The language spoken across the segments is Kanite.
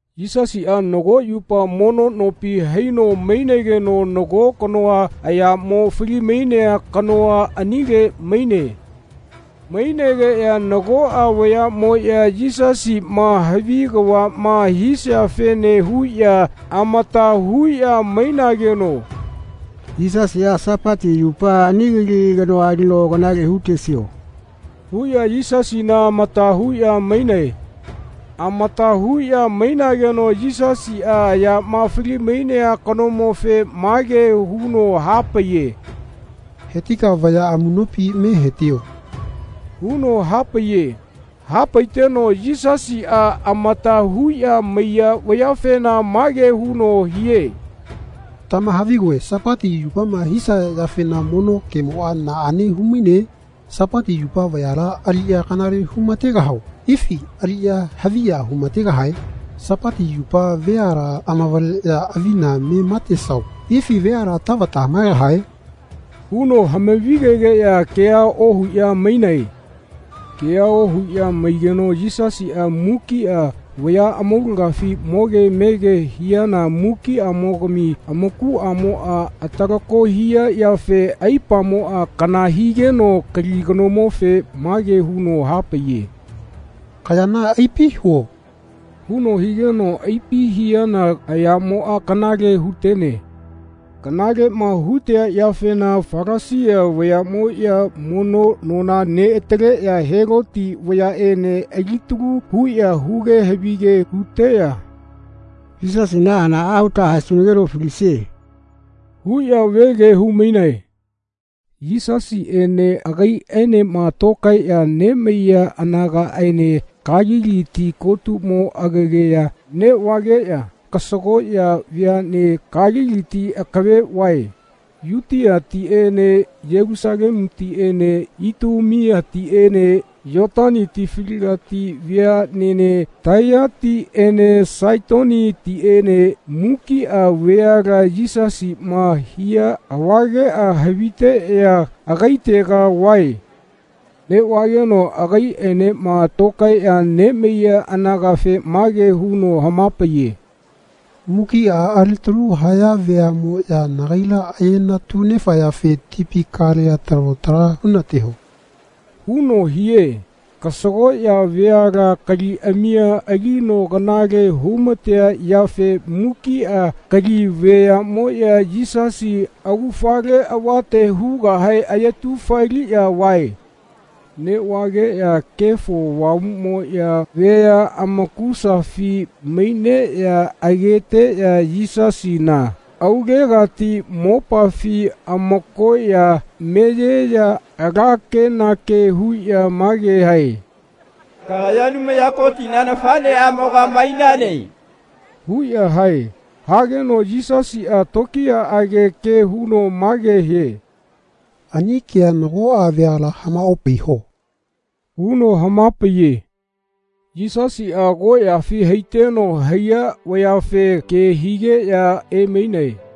Yisasiꞌa nago yupa mono nopi haino mainegeno nago kanoa ayamo falimainea kanoa anile maine. Mainegeꞌya nagoꞌa vayaꞌmoꞌya Yisasiꞌma havi kavaꞌma hisiafene huꞌya amata huꞌya mainageno “Yisasiꞌa Sapati yupa ani kali kanoa alino kanale hutesio.” huꞌya Yisasina amata huꞌya mainae. Amata huꞌya mainageno Yisasiꞌa ayama falimainea kanomofe mage huno hapaiye “Hetika vaya amuꞌnopi me hetio.” huno hapaiye. Hapaiteno Yisasiꞌa amata huꞌya maiya vayafena mage huno hie “Tamahavigoe Sapati yupama hisaya yafena mono kemoꞌa naꞌane humaine? Sapati yupa vayala aliꞌya kanale humategahao ifi ali haviya humategahae? Sapati yupa veala amavaleꞌya avina me matesao ifi veala tavata hamaegahae?” huno hamavigegeꞌya kea ohuꞌya mainae. Kea ohuꞌya maigeno Yisasiꞌa mukiꞌa vaya amaulagafi moge mege hiana mukiꞌamogami amakuꞌmoꞌa atalako hia yafe aipamoꞌa kana higeno kali kanomofe mage huno hapaiye “Kayana aipi huo.” huno higeno aipi hiana ayamoꞌa kanale hutene. Kanaleꞌma hutea yafena Falasia vayaꞌmoꞌya mono nona neꞌataleꞌya Heloti vayaꞌene alitalu huꞌya huge havige huteꞌya “Yisasina hanaꞌa huta haesunageno falisie.” huꞌya vege humainae. Yisasiꞌene agaiꞌaenema tokaeꞌya nemaiya anagaꞌaene Kalili ti kotumo agegaya neꞌvageꞌya kasagoꞌya veaꞌne Kaliliti akave vae. Yutiatiꞌene Yelusalemutiꞌene Itumeatiꞌene Yotani tifaligati veaꞌnene Taiyatiꞌene Saitonitiꞌene mukiꞌa veala Yisasiꞌma hia avageꞌa haviteꞌya agaitega vae. Neꞌvageno agaiꞌaenema tokaeꞌya nemaiya anagafe mage huno hamapaiye “Mukiꞌa alitalu haya veaꞌmoꞌya nagaila ayenatunefayafe tipi kalea talo tala hunateho.” huno hie. Kasagoꞌya veala kaliꞌamia alino kanale humatea yafe mukiꞌa kali veaꞌmoꞌya Yisasi augafale avate hugahe ayetufeliꞌya vae. Neꞌvageꞌya Kefo Avamuꞌmoꞌya vea amakusafi maineꞌya ageteꞌya Yisasina aulegati mopafi amakoꞌya meyeꞌya ala kenake huꞌya mage hae “Kagaya Anumaya Kotina nafaꞌneꞌamoga mainane.” huꞌya hae. Hageno Yisasiꞌa tokiyaꞌage ke huno mage hie “Ani kea nagoꞌa veala hamaopaiho.” huno hamapaiye. Yisasiꞌa agoꞌyafi haiteno haiya vayafe ke higeꞌya emainae.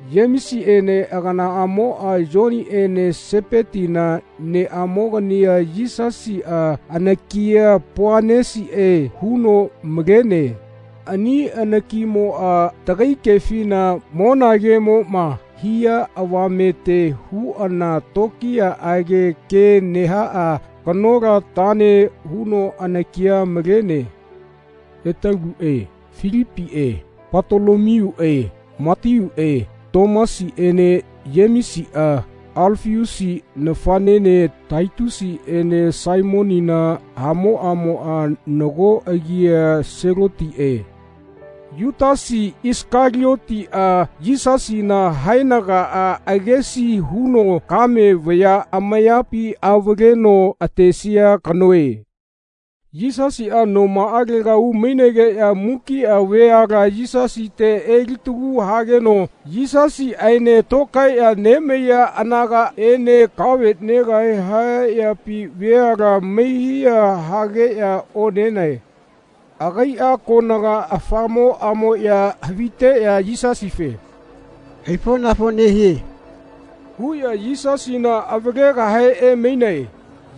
Yemesiꞌene aganaꞌamoꞌa Yoniꞌene Sepetina neꞌamogania Yisasiꞌa anakia Poanesiꞌe huno malene. Ani anakimoꞌa tagai kefina monagemoꞌma hia avamete huꞌana tokiyaꞌage ke nehaꞌa kanolatane huno anakia malene. Etaluꞌe Filipiꞌe Patolomiuꞌe Matiuꞌe Tomasiꞌene Yemesiꞌa Alafiusi nafaꞌnene Tatiusiꞌene Saimonina hamoꞌamoꞌa nago agia Selotiꞌe. Yutasi Isakaliotiꞌa Yisasina haenagaꞌa agesi huno kame vaya amayapi avaleno atesia kanoe. Yisasiꞌa nomaꞌalega umainegeꞌya mukiꞌa veala Yisasite elitalu hageno Yisasiꞌaene tokaeꞌya nemaiya anagaꞌene kave negahe haya yapi veala mehiya hageꞌya onenae. Agaiꞌa konaga afamoꞌamoꞌya haviteꞌya Yisasife “Aifonafo nehie.” huꞌya Yisasina avalegahe emainae.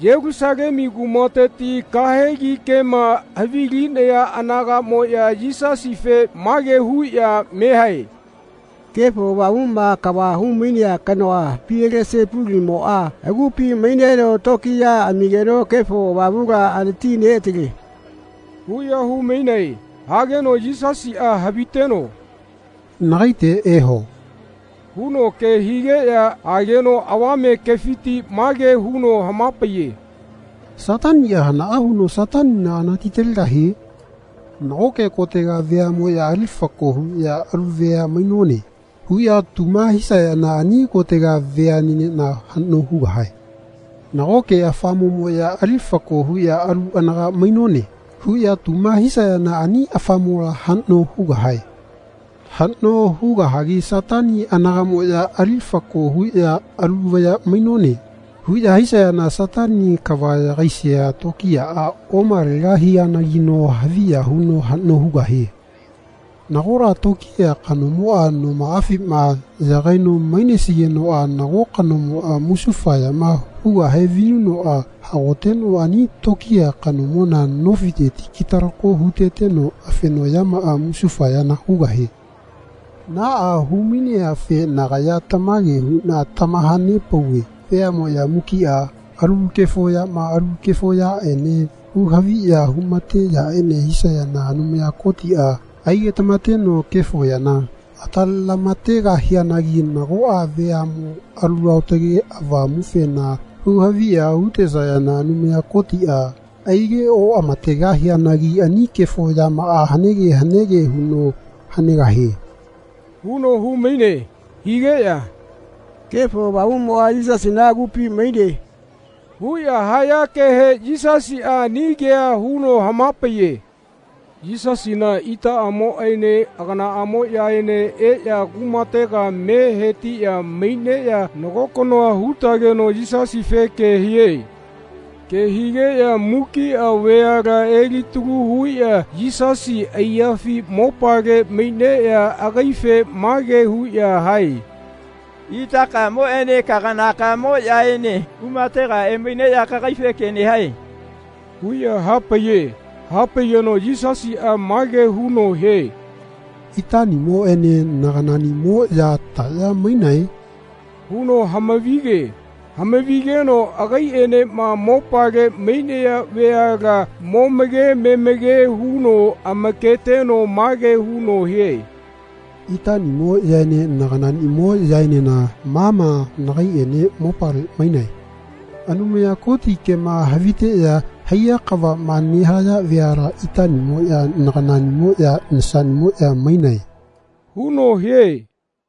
Yelusalemu kumateti kahegi kema havilinaya anagaꞌmoꞌya Yisasife mage huꞌya mehae “Kefo Avamuꞌma kava humainea kanoa Pielesepulimoꞌa agupi maineno tokiya amigeno Kefo Avamula anatineꞌatale.” huꞌya humainae. Hageno Yisasiꞌa haviteno “Nagaite eho.” huno ke higeꞌya ageno avame kefiti mage huno hamapaiye “Sataniꞌa hanaꞌa huno Satanina anatitalegahie? Nagoke kotega veaꞌmoꞌya ali fako huꞌya “Alu vea mainone.” huꞌya tuma hisayana ani kotega veaꞌnenena haꞌno hugahae. Nagoke afamoꞌmoꞌya ali fako huꞌya “Alu anaga mainone.” huꞌya tuma hisayana ani afamola haꞌno hugahae. Haꞌno hugahagi Satani anagaꞌmoꞌya ali fako huꞌya “Alu vaya mainone.” huꞌya hisayana Satani kava yagaisia tokiyaꞌa omalegahianagino haviya huno haꞌno hugahie. Nagola tokiya kanomoꞌa nomaꞌafima yagaino mainesigenoꞌa nago kanomoꞌa musufa yama hugahe vinunoꞌa hagoteno ani tokiya kanomona nofiteti kitalako huteteno afenoꞌyamaꞌa musufa yana hugahie. Naꞌa humaineafe nagaya tamage huꞌna tamahanepauve veaꞌmoꞌya mukiꞌa alu kefo yama alu kefo yaꞌene huhaviya humate yaꞌene hisayana Anumaya Kotiꞌa aigetamateno kefo yana atalelamategahianagi nagoꞌa veaꞌmo Alu Aotage Avamufema huhaviya hutesayana Anumaya Kotiꞌa aigeoꞌamategahianagi ani kefo yamaꞌa hanege hanege huno hanegahie.” huno humaine. Higeꞌya “Kefo Avamuꞌmoꞌa Yisasiꞌna agupi maine.” huꞌya haya kehe Yisasiꞌa ani kea huno hamapaiye. Yisasina itaꞌamoꞌene aganaꞌamoꞌyaene eꞌya kumatega me hetiꞌya maineꞌya nago kanoa hutageno Yisasife ke hie. Ke higeꞌya mukiꞌa veala elitalu huꞌya Yisasina aiyafi mopale maineꞌya agaife mage huꞌya hae “Itakamoꞌene kaganakamoꞌyaene kumatega emaineꞌya kagaife ke nehae.” huꞌya hapaiye. Hapaigeno Yisasiꞌa mage huno hie “Itaꞌnimoꞌene naganaꞌnimoꞌya taꞌya mainae?” huno hamavige. Hamavigeno agaiꞌenema mopale mainaya veala momake memake huno amaketeno mage huno hie “Itaꞌnimoꞌyaene naganaꞌnimoꞌyaenena ma ma nagaiꞌene mopale mainae. Anumaya Koti kema haviteꞌya haiya kavaꞌma nehaya veala itaꞌnimoꞌya naganaꞌnimoꞌya nasaꞌnimoꞌya mainae.” huno hie.